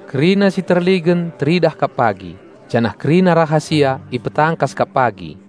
Kerina si terligen teridah kap pagi, janah kerina rahasia ipetangkas kap pagi.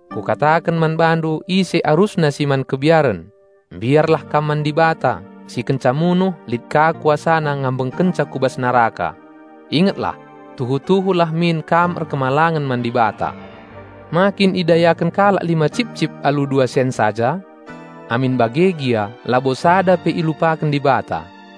Kukataken man bandu ise arusna si man kebiaren: Mbiarlah kam man Dibata, si kenca munuh, lit ka KuasaNa ngambengkenca ku bas neraka. Ingetlah, tuhu-tuhu lah min kam erkemalangen man Dibata! Ma kin idayaken kalak lima cipcip alu dua sen saja? Amin bage gia labo sada pe ilupaken Dibata.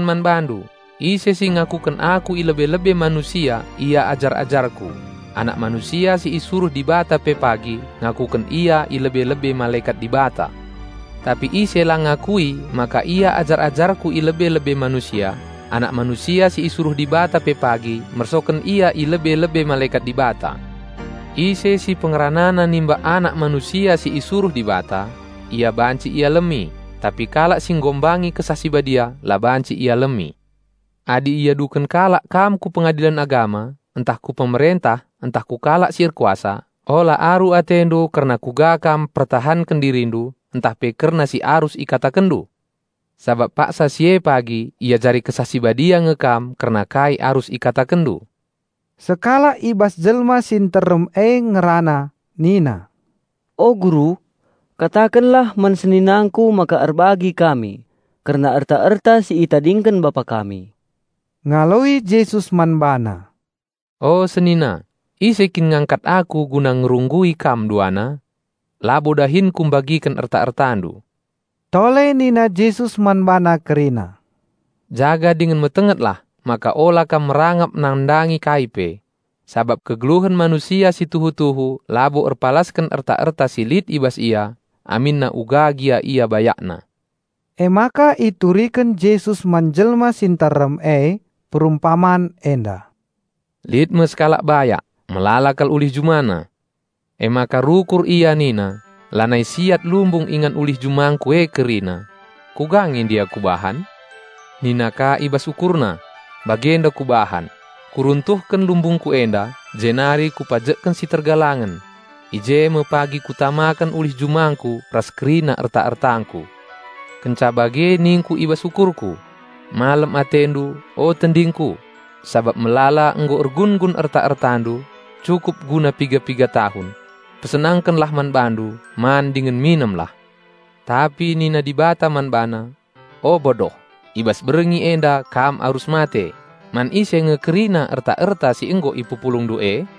"Kukataken man bandu, ise si ngakuken Aku i lebe-lebe manusia ia ajar-ajarKu, Anak Manusia si isuruh Dibata pe pagi ngakuken ia i lebe-lebe malekat Dibata. Tapi ise la ngakui maka ia ajar-ajarKu i lebe-lebe manusia, Anak Manusia si isuruh Dibata pe pagi mersoken ia i lebe-lebe malekat Dibata. Ise si pengeranana nimbak Anak Manusia si isuruh Dibata, ia banci ialemi, tapi kalak si enghina Kesah Si Badia la banci ialemi. Adi iaduken kalak kam ku Pengadilen Agama, ntah ku pemerentah ntah ku kalak si erkuasa, ola aru atendu kerna kuga kam mpertahanken dirindu, ntah pe kerna si arus ikatakenndu. Sabap paksa si e pagi iajari Kesah Si Badia nge kam kerna kai arus ikatakenndu." Sekalak i bas jelma si nterem e ngerana nina, "O Guru, katakenlah man seninangku maka erbagi kami kerna erta-erta si itadingken bapa kami." Ngaloi Jesus man bana, "O senina, ise kin ngangkat Aku guna ngerunggui kam duana? Labo dahinKu mbagiken erta-ertandu." Tole nina Jesus man bana kerina, "Jaga dingen metengetlah maka ola kam merangap nandangi kai pe; sabap kegeluhen manusia si tuhu-tuhu labo erpalasken erta-erta si lit i bas ia, aminna uga gia ia bayakna." Emaka ituriken Jesus man jelma si nterem e perumpaman enda, "Lit me sekalak bayak, melala kal ulih jumana. Emaka rukur ia nina, 'Lanai siat lumbung ingan ulih jumangku e kerina. Kuga nge ndia kubahan?' Nina ka i bas ukurna, 'Bagenda kubahan: Kuruntuhken lumbungku enda, jenari kupajekken si tergalangen; i je me pagi kutamaken ulih jumangku ras kerina erta-ertangku. Kenca bage ningku i bas ukurku: Malem atendu, o tendingku! Sabap melala nggo ergun-gun erta-ertandu, cukup guna piga-piga tahun. Pesenangkenlah man bandu, man dingen minemlah.' Tapi nina Dibata man bana, 'O, bodoh! I bas berngi enda kam arus mate; man ise nge kerina erta-erta si nggo ipepulungndu e?'"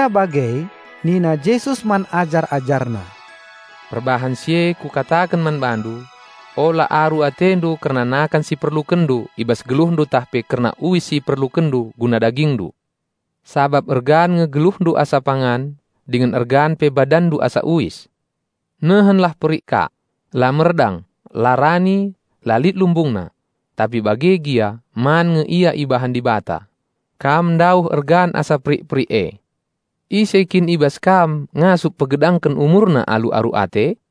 Kenca bage nina Jesus man ajar-AjarNa, "Perbahan si e Kukataken man bandu: ola aru atendu kerna nakan si iperlukenndu i bas geluhndu ntah pe kerna uis si iperlukenndu guna dagingndu. Sabap ergan nge geluhndu asa pangan, dingen ergan pe badanndu asa uis. Nehenlah perik kak: la merdang, la rani, la lit lumbungna; tapi bage gia man nge ia ibahan Dibata. Kam ndauh ergan asa perik-perik e. Ise kin i bas kam ngasup pegedangken umurna alu aru ate?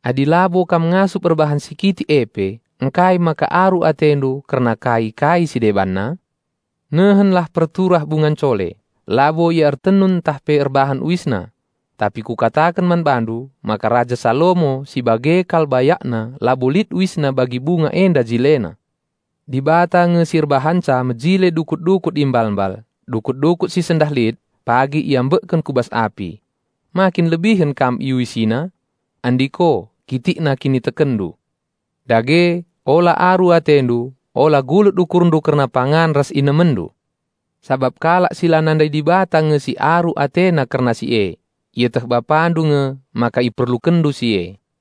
Adi labo kam ngasup erbahan si kitik e pe, ngkai maka aru atendu kerna kai-kai si debanna? Nehenlah perturah bunga ncole, labo ia ertenun ntah pe erbahan uisna. Tapi kukataken man bandu maka raja Salomo si bage kal bayakna labo lit uisna bagi bunga enda jilena. Dibata nge si erbahanca mejile dukut-dukut i mbalmbal -- dukut-dukut si sendah lit, pagi iambekken ku bas api. Makin lebihen kam IuisiNa? Andiko, kitikna kinitekenndu! Dage, ola aru atendu, ola gulut ukurndu kerna pangan ras inemenndu. (Sabap kalak si la nandai Dibata nge si aru atena kerna si e.) Ieteh Bapandu nge maka iperlukenndu si e.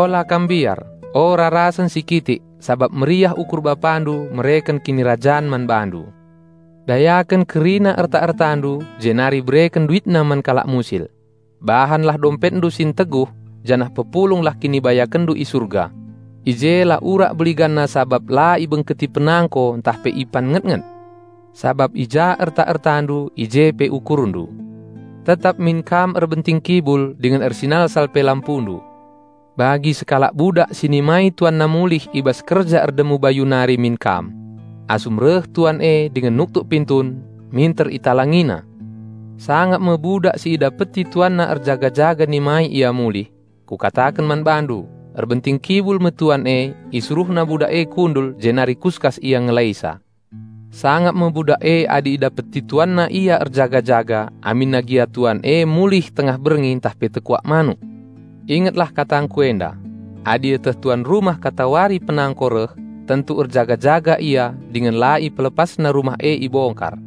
"Ola kam mbiar, o rarasen si kitik sabap meriah ukur Bapandu mereken Kinirajan man bandu. Dayaken kerna erta-ertandu jenari bereken duitna man kalak musil. Bahanlah dompetndu si nteguh janah pepulunglah kinibayakenndu i Surga. I je la urak beliganna sabap la ibengketi penangko ntah pe ipan ngetnget. Sabap i ja erta-ertandu i je pe ukurndu." "Tetap min kam erbenting kibul dingen ersinalsal pe lampundu. Bagi sekalak budak si nimai tuanna mulih i bas kerja erdemu bayu nari min kam. Asum reh tuan e dingen nuktuk pintun, minter italangina. Sangap me budak si idapeti tuanna erjaga-jaga nimai ia mulih. Kukataken man bandu, erbenting kibul me tuan e, isuruhna budak e kundul jenari kuskas ia ngelaisa. Sangap me budak e adi idapeti tuanna ia erjaga-jaga aminna gia tuan e mulih tengah berngi ntah pe tekuak manuk. Ingetlah katangKu enda: Adi ieteh tuan rumah katawari penangko reh, tentu erjaga-jaga ia dingen la ipelepasna rumah e ibongkar.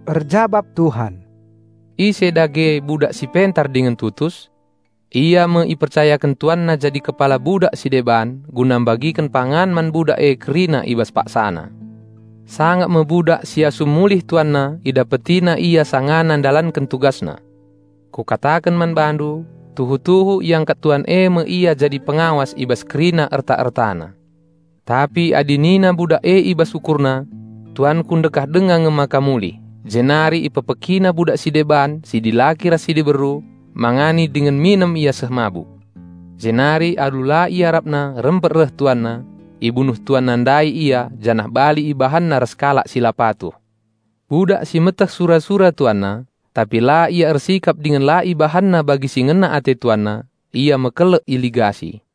Erjabap Tuhan, "Ise dage budak si pentar dingen tutus? Ia me ipercayaken tuanna jadi kepala budak si deban guna mbagiken pangan man budak e kerina i bas paksana. Sangap me budak si asum mulih tuanna idapetina ia sangana ndalanken tugasna! Kukataken man bandu, tuhu-tuhu iangkat tuan e me ia jadi pengawas i bas kerina erta-ertana. Tapi adi nina budak e i bas ukurna, 'Tuanku ndekah denga nge maka mulih,' jenari ipekpekina budak si deban si dilaki ras si diberu, mangani dingen minem ia seh mabuk. Jenari alu la iarapna rempet reh tuanna. Ibunuh tuanna ndai ia janah bali ibahanna ras kalak si la patuh. Budak si meteh sura-sura tuanna, tapi la ia ersikap dingen la ibahanna bagi si ngena ate tuanna, ia mekelek iligasi.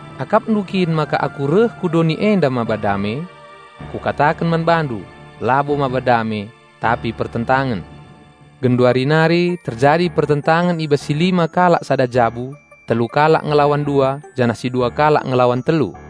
Akapndu kin maka Aku reh ku doni enda maba dame? Kukataken man bandu, labo maba dame, tapi pertentangen. Genduari nari terjadi pertentangen i bas si lima kalak sada jabu, telu kalak ngelawan dua, janah si dua kalak ngelawan telu.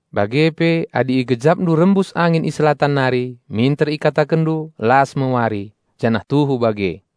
Bage pe adi igejapndu rembus angin i Selatan nari, minter ikatakenndu, 'Las me wari,' janah tuhu bage.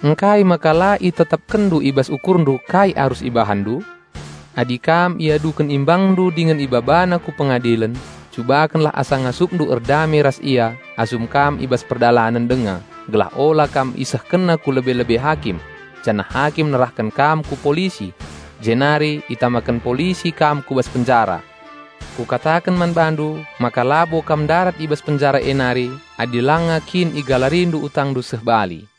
"Ngkai maka la itetapkenndu i bas ukurndu kai arus ibahanndu? Adi kam iaduken imbangndu dingen ibabanandu ku pengadilen, cubakenlah asa ngasupndu erdame ras ia asum kam i bas perdalanen denga gelah ola kam isehkenna ku lebe-lebe hakim, janah hakim nerahken kam ku polisi, jenari itamaken polisi kam ku bas penjara. Kukataken man bandu maka labo kam ndarat i bas penjara e nari, adi langa kin igalarindu utangndu seh bali."